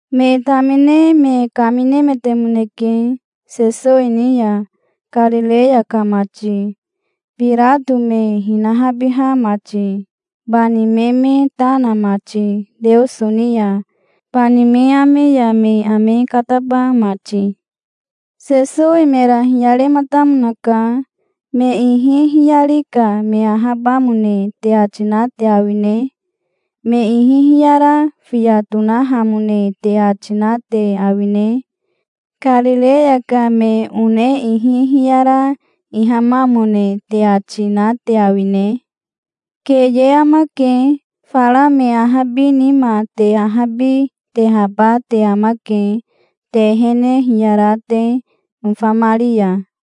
Me tamine me kaminemetemoneke Sesowi ni ya, Karireya ka mati, Birato me hinahabiha mati, bani me me ta na mati Teoso ni ya, bani me ame ya me ame kataba mati. Sesowi mera hiyarematamonaka. "Me ihi hiyari ka me ahabamone te ati na te awine? Me ihi hiyara fiya tonahamone te ati na te awine? Karireya ka me one ihi hiyara ihamamone te ati, na te awine? Keye amake. Fara me ahabi nima te ahabi tehaba te amake, te ehene hiyara te nofamari ya.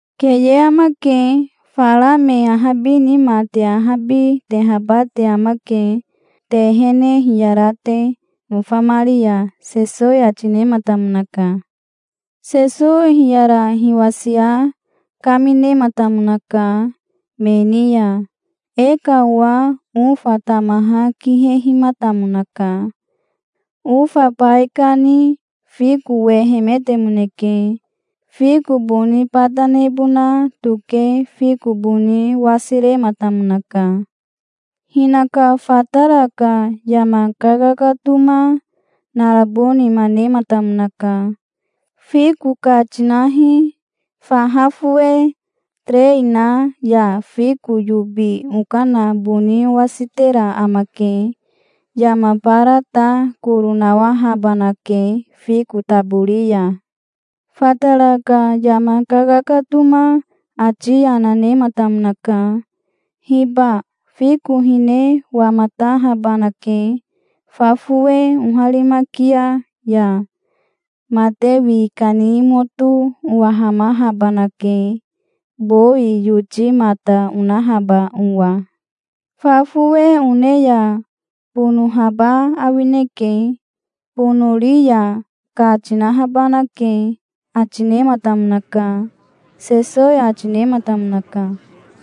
Keye amake. Fara me ahabi nima te ahabi tehaba te amake, te ehene hiyara te nofamari ya", Sesowi ati nematamonaka. Sesowi hiyara hiwasia kaminematamonaka me ni ya. "E ka owa ofa tamaha kihehimatamonaka. Ofa baikani fiko wehemetemoneke. Fiko boni bata nebona toke fiko boni wasirematamonaka. Hinaka fatara ka yama kakakatoma narabo nima nematamonaka. 'Fiko ka tinahi. Faha fowe terei na ya fiko yobi okana boni owasitera amake. Yama bara ta koro nawahabanake fiko tabori ya'. Fatara ka yama kakakatoma ati yana nematamonaka. 'Hiba fiko hine wamatahabanake fa fowe oharimakia ya. Mate wi kani moto owahamahabanake, bowi yoti mata onahaba owa. Fa fowe one ya bonohaba awineke. Bonori ya ka tinahabanake', ati nematamonaka", Sesowi ati nematamonaka.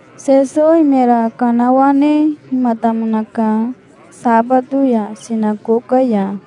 Sesowi mera kanawanehimatamonaka sabato ya sinakoka ya.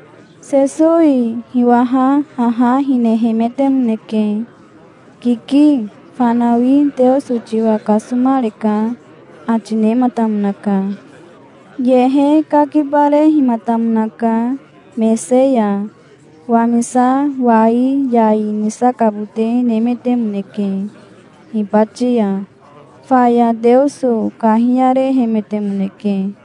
Sesowi hiwaha haha hinehemetemoneke. "Kiki, fanawi Teoso tiwa kasomareka", ati nematamonaka. Yehe kakibarehimatamonaka mese ya. Wamisa wai yai nisakabote nemetemoneke hibati ya. Faya Teoso kahiyarehemetemoneke.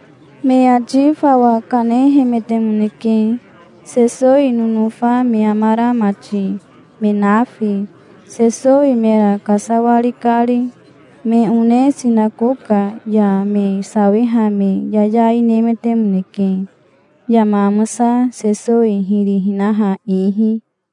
Me ati fawa kanehemetemoneke, Sesowi nonofa me amara mati, me nafi, Sesowi mera kasawari kari. Me one sinakoka ya me sawiha me yayai nemetemoneke yama amosa Sesowi hiri hinaha ihi.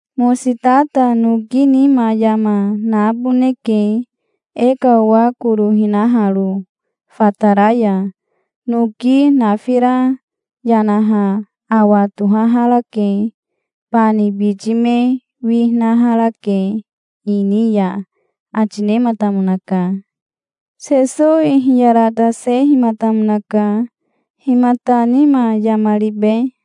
Mositata noki nima yama naboneke, e ka owa koro hinaharo, fatara ya. Noki nafira yanaha awa tohaharake. Bani biti me winaharake ini ya", ati nematamonaka. Sesowi hiyaratasehimatamonaka. "Himata nima yama ribe?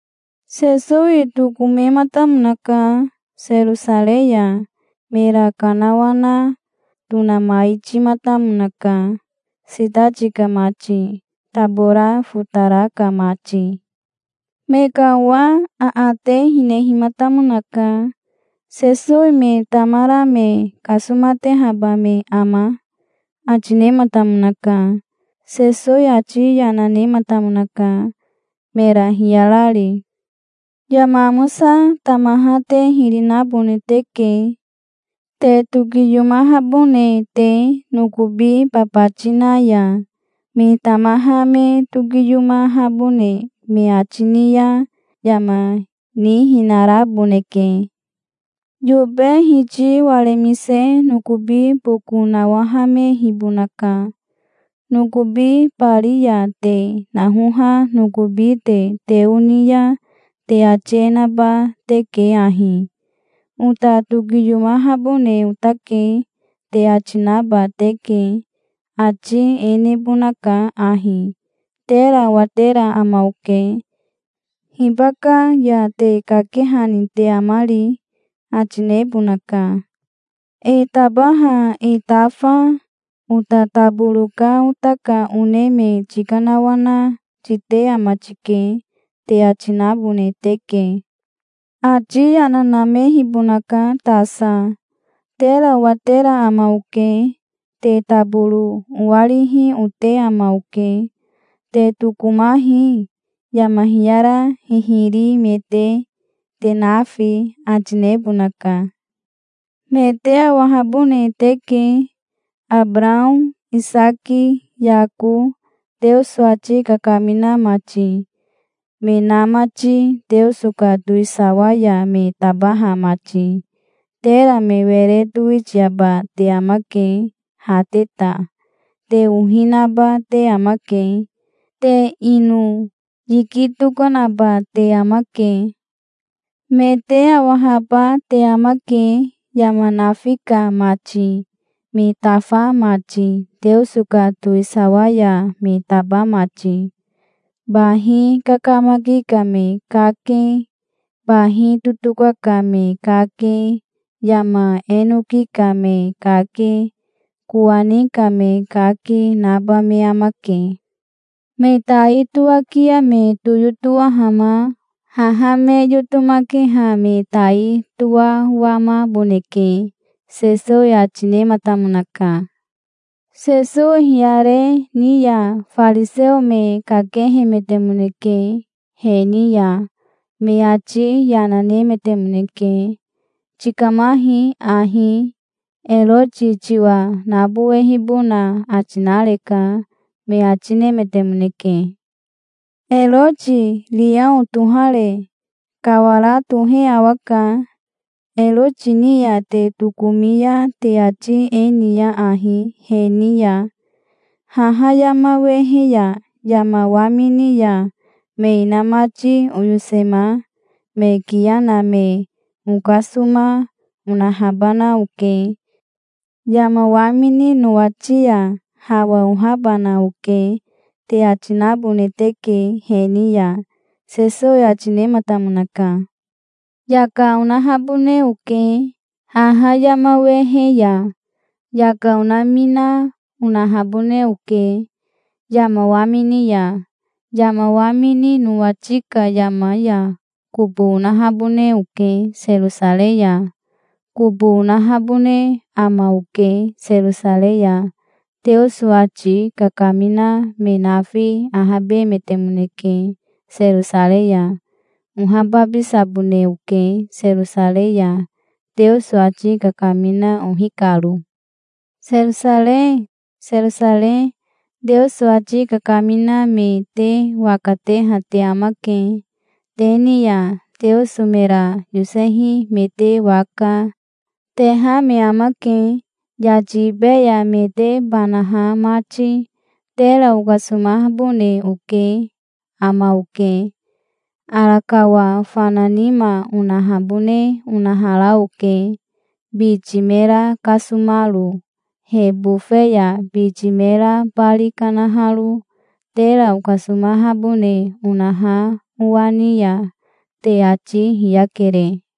Sesowi tokomematamonaka Serosarei ya. Mera kanawana tonamaitimatamonaka, sitati ka mati, tabora fotara ka mati. Me ka owa aate hinehimatamonaka. "Sesowi me tamara me kasomatehaba me ama?" ati nematamonaka. Sesowi ati yana nematamonaka, mera hiyarari. "Yama amosa tamaha te hiri nabone teke, te tokiyomahabone te, nokobi babati na ya. Me tamaha me tokiyomahabone me ati ni ya yama nihinaraboneke. Yobe hiti waremise nokobi boko nawahamehibonaka. Nokobi bari ya te nahoha nokobi te teo ni ya te ati e naba teke ahi: 'Ota tokiyomahabone otake', te ati naba teke. Ati e nebonaka ahi: 'Tera owatera ama oke. Hibaka ya te kakehani te amari?' ati nebonaka. 'E tabaha e tafa, ota taboro ka ota ka one me tikanawana, tite ama tike', te ati nabone teke. Ati yana namehibonaka tasa. 'Tera owatera ama oke. Te taboro owarihi ote ama oke. Te tokomahi, yama hiyara hihiri me te, te nafi', ati nebonaka. Me te awahabone teke, Abarao, Isaki, Yako, Teoso ati kakamina mati, me na mati, Teoso ka towisawa ya me tabaha mati. Tera me were towitiaba te amake, ha te ta. Te ohi naba te amake. Te ino yiki tokanaba te amake. Me te awahaba te amake yama nafi ka mati, me tafa mati, Teoso ka towisawa ya me taba mati. Bahi kakamaki ka me kake, bahi totoka ka me kake, yama enoki ka me kake, kowani ka me kake, naba me amake. Me tai toakia me toyotowahama haha me yotomakeha me tai toawamaboneke", Sesowi ati nematamonaka. Sesowi hiyare ni ya fariseo me kakehemetemoneke he ni ya. Me ati yana nemetemoneke. "Tikamahi ahi. Eroti tiwa nabowehibona ati nareka", me ati nemetemoneke. "Eroti riao tohare kawara tohe awaka. Eroti ni ya te tokomi ya te ati e niya ahi he ni ya: 'Haha yama wehe ya yama wamini ya me inamati oyosema, me kiya na me okasoma, onahabana oke. Yama wamini nowati ya hawa ohahabana oke', te ati nabone teke he ni ya", Sesowi ati nematamonaka. "Yaka onahabone oke, haha yama wehe ya. Yaka onamina, onahabone oke, yama wamini ya. Yama wamini nowati ka yama ya kobo onahabone oke Serosarei ya. Kobo onahabone ama oke Serosarei ya. Teoso ati kakamina me nafi ahabemetemoneke Serosarei ya. Ohababisabone oke Serosarei ya, Teoso ati kakamina ohi karo". "Serosarei, Serosarei. Teoso ati kakamina me te waka teha te amake. Te ni ya Teoso mera yosehi me te waka, teha me amake, yati ibe ya me te banaha mati. Tera okasomabone ote ama oke. Arakawa fana nima onahabone onahara oke, biti mera kasomaro he bofe ya, biti mera bari kanaharo. Tera okasomahabone onaha owa ni ya te ati hiyakere.